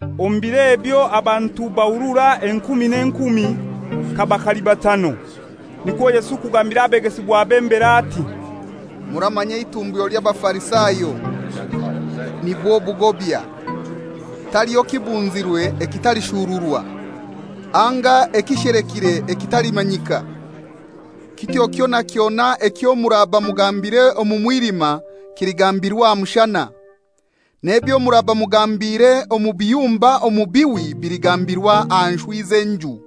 Omu biro ebyo abantu bahurura enkumi n'enkumi, kaba kalibatano. Nikwo Yesu kugambira abegesibwabe mbere ati, «Muramanya eitumbyo ly'Abafarisayo, nibwo bugobya. Taliho kibunzirwe ekitalishururwa, anga ekishelekire ekitalimanyika. Kityo kyona kyona ekyo muraba mugambire omu mwilima kiligambirwa aha mushana, n'ebyo muraba mugambire omu biyumba omu bihwi biligambirwa aha nshwi z'enju.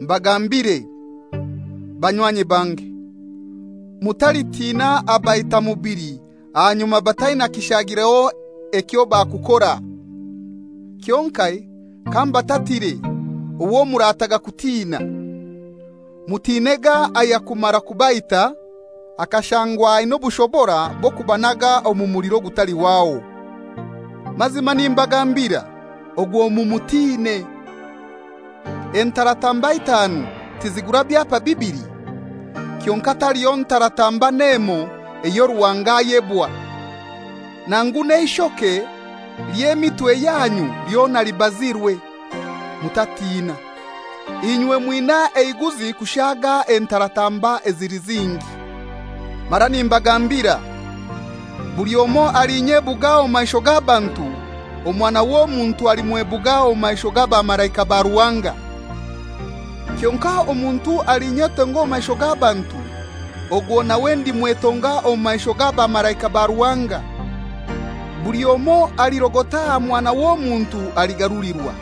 «Mbagambire, banywanyi bange, mutalitina abaita omubili ahanyuma bataina kishagireho ekyo bakukora. Kyonkai kambatatire owo murataga kutina: Mutinega ayakumara kubaita, akashangwa aina obushobora bw'okubanaga omu muliro ogutalihwaho. Mazima nimbagambira, ogwo mumutine! Entaratamba itaanu tizigura byapa bibili? Kyonkai taliho ntaratamba n'emoi eyo Ruhanga ayebwa. Nangu n'eishoke ly'emitwe yanyu lyona libazirwe. Mutatina; inywe mwina eiguzi kushaaga entaratamba ezili zingi. «Mara nimbagambira, buli omoi alinyebuga omu maisho g'abantu, Omwana w'Omuntu alimwebuga omu maisho g'abamalaika ba Ruhanga. Kyonkai omuntu alinyetonga omu maisho g'abantu, ogwo nawe ndimwetonga omu maisho g'abamalaika ba Ruhanga. Buli omoi alirogota aha Mwana w'Omuntu aligarulirwa;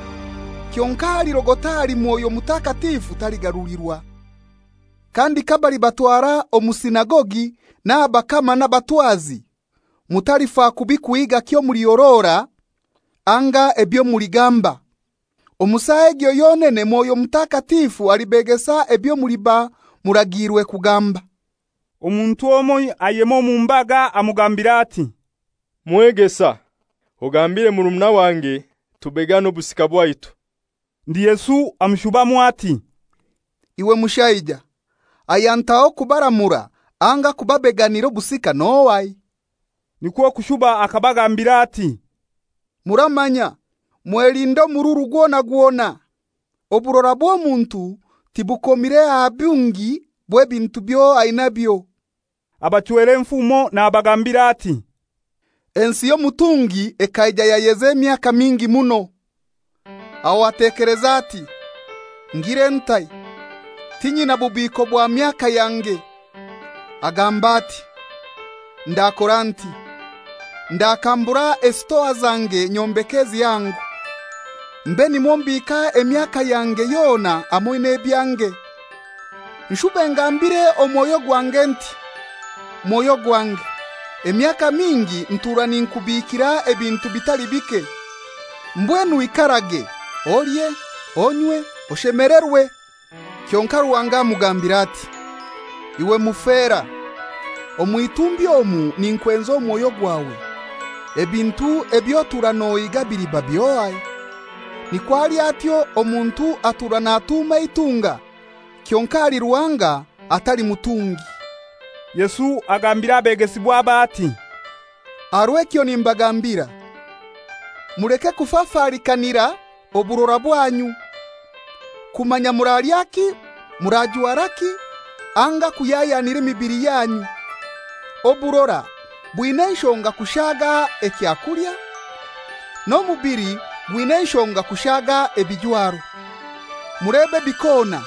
kyonkai alirogota ahali Mwoyo Mutakatifu taligarulirwa. Kandi kabalibatwara omu sinagogi n'aha bakama n'abatwazi, mutalifa kubi kuhiiga kwomulihorora anga ebyo muligamba. Omu saa egyo yonene Mwoyo Mutakatifu alibegesa ebyo muliba muragiirwe kugamba.» Omuntu omoi ayema omu mbaga amugambira ati, «Mwegesa, ogambire murumuna wange tubegane obusika bwaitu.» Ndi Yesu amushubamu ati, «Iwe mushaija, ayantaho kubaramura anga kubabeganira obusika n'ohai?» Nikwo kushuba akabagambira ati, «Muramanya, mwelinde omururu gwona gwona. Oburora bw'omuntu tibukomire aha bungi bw'ebintu ebyo ainabyo.» Abachwera enfumo nabagambira ati, «Ensi y'omutungi ekaija yayeza emyaka nyingi muno. Aho atekeleza ati, ‹Ngire ntai? Tinyina bubiiko bwa myaka yange.› Agamba ati, ‹Ndakora nti: Ndakambura esitoa zange nyombeke ezihango, mbe nimwo mbiika emyaka yange yona hamoi n'ebyange. Nshube ngambire omwoyo gwange nti, mwoyo gwange, emyaka nyingi ntura ninkubiikira ebintu bitali bike. Mbwenu ikarage, olye, onywe, oshemelerwe.› Kyonkai Ruhanga amugambira ati, ‹Iwe mufera! Omw'itumbi omu ninkwenza omwoyo gwawe. Ebintu eby'otura nohiiga biliba by'ohai?› Nikwo ali atyo omuntu atura natuuma eitunga, kyonkai ahali Ruhanga atali mutungi.» Yesu agambira abegesibwabe ati, «Aha rw'ekyo nimbagambira, muleke kufafalikanira oburora bwanyu, kumanya muralyaki, murajwaraki; anga kuhyahyanira emibili yanyu. Oburora bwina enshonga kushaaga ekyakulya, n'omubili gwina enshonga kushaaga ebijwaro. Mulebe ebikona: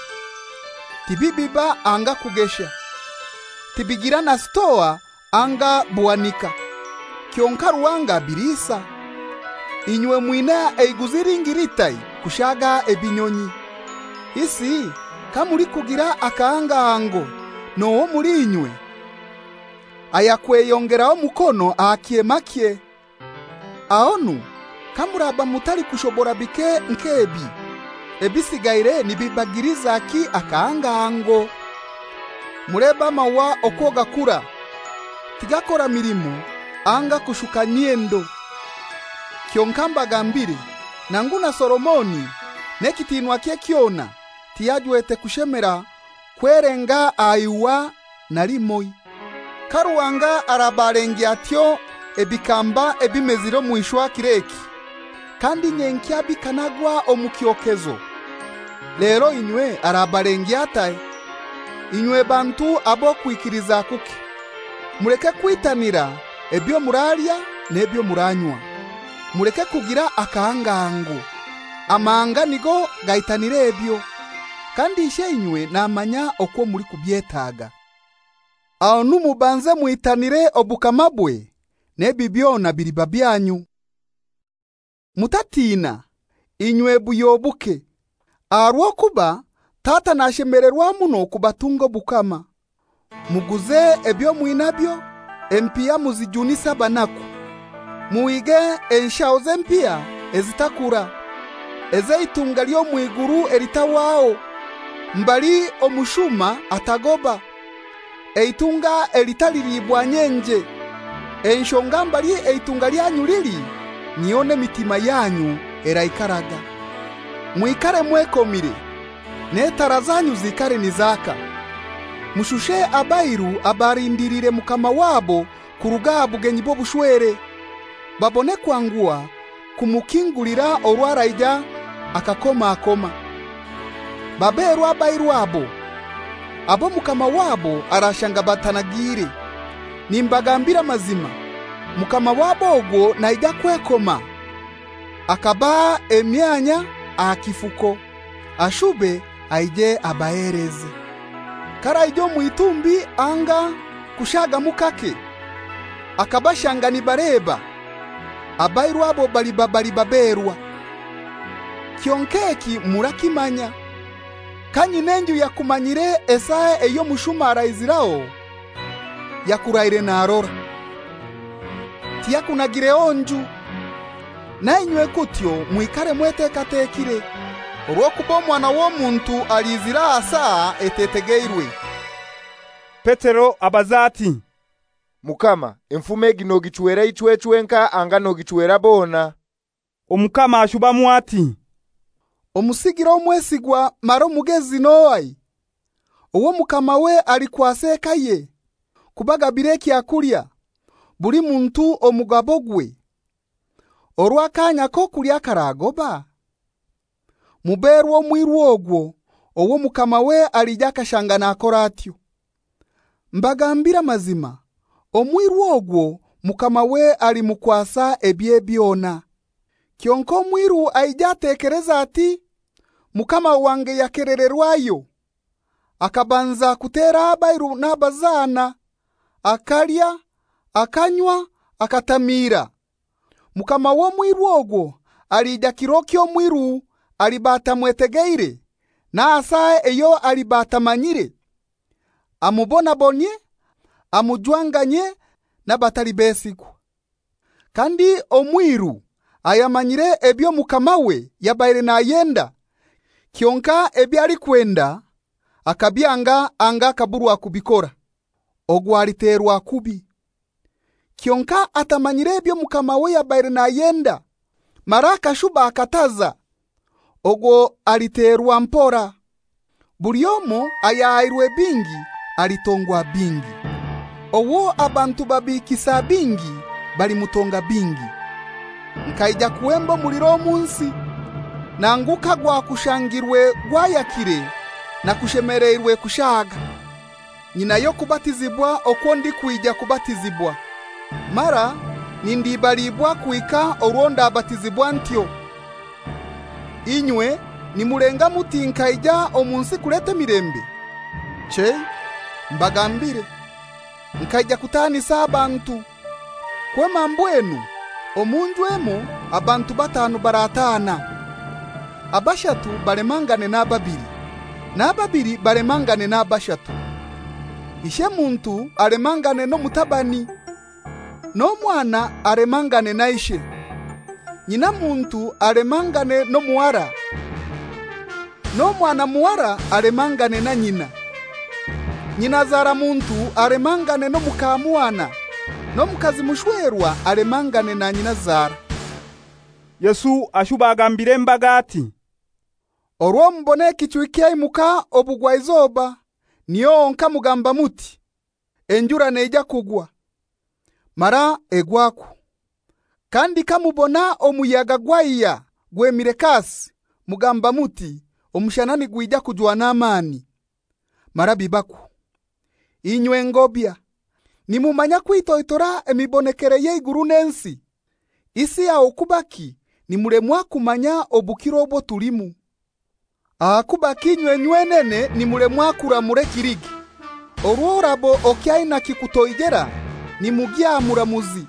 Tibibiba anga kugesha, tibigira na sitoa anga buhanika, kyonkai Ruhanga abiliisa. Inywe mwina eiguzi lingi litai kushaaga ebinyonyi! Isi kamulikugira akahangahango, n'ohai omuli inywe ayakweyongeraho omukono aha kyemakye? Ahonu kamuraba mutalikushobora bike nk'ebi, ebisigaire nibibagilizaki akahangahango? Mulebe amaua okwo gakura. Tigakora milimo anga kushuka myendo. Kyonkai mbagambire, nangu na Solomoni n'ekitinwakye kyona, tiyajwete kushemera kwelenga aha iua na limoi. Ka Ruhanga araba alengya atyo ebikamba ebimezire omu ishwa kir'eki, kandi nyenkya bikanagwa omu kyokezo, lero inywe arabalengya atai, inywe bantu ab'okwikiliza kuke! Muleke kwitanira ebyo muralya n'ebyo muranywa, muleke kugira akahangahango. Amahanga nigo gaitanira ebyo. Kandi Isheinywe namanya okwo mulikubyetaga. Ahonu mubanze mwitanire obukamabwe; n'ebi byona biliba byanyu. «Mutatiina, inywe buhyo buke, aha rw'okuba Tata nashemelerwa muno kubatunga obukama. Muguze ebyo mwinabyo, empiha muzijunise abanaku. Muhige enshaho z'empiha ezitakura, ez'eitunga ly'omw'iguru elitahwaho, mbali omushuma atagoba, eitunga elitaliibwa nyenje. Enshonga mbali eitunga lyanyu lili, niho n'emitima yanyu eraikaraga. «Mwikare mwekomire, n'etara zanyu ziikare nizaka. Mushushe abairu abalindiliire mukama wabo kuruga aha bugenyi bw'obushwere, babone kwanguha kumukingulira orwo araija akakomakoma. Baberwa abairu abo, abo mukama wabo arashanga batanagiire. Nimbagambira amazima, mukama wabo ogwo naija kwekoma, akabaha emyanya aha kifuko, ashube aije abaheleze. K'araija omw'itumbi anga kushagamu kake, akabashanga nibaleba, abairu abo baraba bali baberwa! Kyonkai eki murakimanya: Kanyin'enju yakumanyire esaa ey'omushuma araiziraho, yakuraire narora, tiyakunagireho nju. Na inywe kutyo mwikare mwetekatekire, orw'okuba Omwana w'Omuntu alizira aha saa etetegeirwe.» Petero abaza ati, «Mukama, enfumo egi nogichwera ichwe chwenkai anga nogichwera bona?» Omukama ashubamu ati, «Omusigire omwesigwa mara omugezi n'ohai, owo mukamawe alikwasa ekaye, kubagabira ekyakulya: Buli muntu omugabogwe, orwo akanya k'okulya kagoba? Muberwa omwiru ogwo owo mukamawe alija akashanga nakora atyo. Mbagambire amazima, omwiru ogwo mukamawe alimukwasa ebye byona. Kyonkai omwiru aije atekeleze ati, ‹Mukama wange yakelererwayo,› akabanza kutera abairu n'abazana, akalya, akanywa, akatamiira, mukama w'omwiru ogwo alija kiro eky'omwiru aliba atamwetegeire n'aha saa eyo aliba atamanyire, amubonabonyie amujwanganyie n'abatali besigwa. Kandi omwiru ayamanyire ebyo mukamawe yabaire nayenda, kyonkai ebyo alikwenda akabyanga anga akaburwa kubikora, ogwo aliterwa kubi. Kyonkai atamanyire byo mukamawe yabaire nayenda, mara akashuba akataza, ogwo aliterwa mpora. Buli omoi ayahairwe bingi, alitongwa bingi. Owo abantu babiikisa bingi balimutonga bingi. «Nkaija kuhemba omuliro omu nsi; nangu kagwakushangirwe gwayakire nakushemeleirwe kushaaga! Nyinayo okubatizibwa okwo ndikwija kubatizibwa; mara nindibaliibwa kuhika orwo ndabatizibwa ntyo! Inywe nimulenga muti nkaija omu nsi kuleta emilembe? Chei, mbagambire, nkaija kutaanisa abantu. Kwema mbwenu omu nju emoi abantu batanu barataana. Abashatu balemangane n'ababili, n'ababili balemangane n'abashatu. Ishemuntu alemangane n'omutabani, n'omwana alemangane na ishe. Nyinamuntu alemangane n'omuhara, n'omwanamuhara alemangane na nyina. Nyinazaramuntu alemangane n'omukamwana, n'omukazi mushwerwa alemangane na nyinazara.» Yesu ashuba agambira embaga ati, «Orwo mubona ekichwi kyaimuka obugwaizoba, niho honkai mugamba muti, ‹Enjura neija kugwa:› mara egwakwo. Kandi kamubona omuyaga gwaihya gwemire kasi, mugamba muti, ‹Omushana nigwija kujwa n'amani;› mara bibakwo. Inywe ngobya! Nimumanya kwitoitora emibonekere y'eiguru n'ensi; isi aho kubaki nimulemwa kumanya obukiro obwo tulimu? «Ahakubaki inywe nywenene nimulemwa kuramura ekilige? Orwo oraba okyaina kikutoijera nimugya aha muramuzi,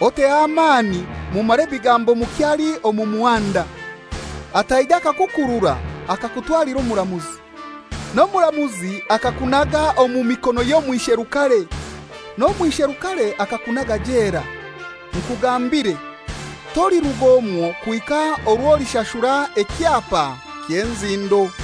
oteho amani mumare ebigambo mukyali omu muhanda, ataija akakukurura akakutwalira omuramuzi, n'omuramuzi akakunaga omu miikono y'omwisherukare, n'omwisherukare akakunaga jela. Nkugambire, toliruga omwo kuhika orwo olishashura ekyapa ky'enzindo.»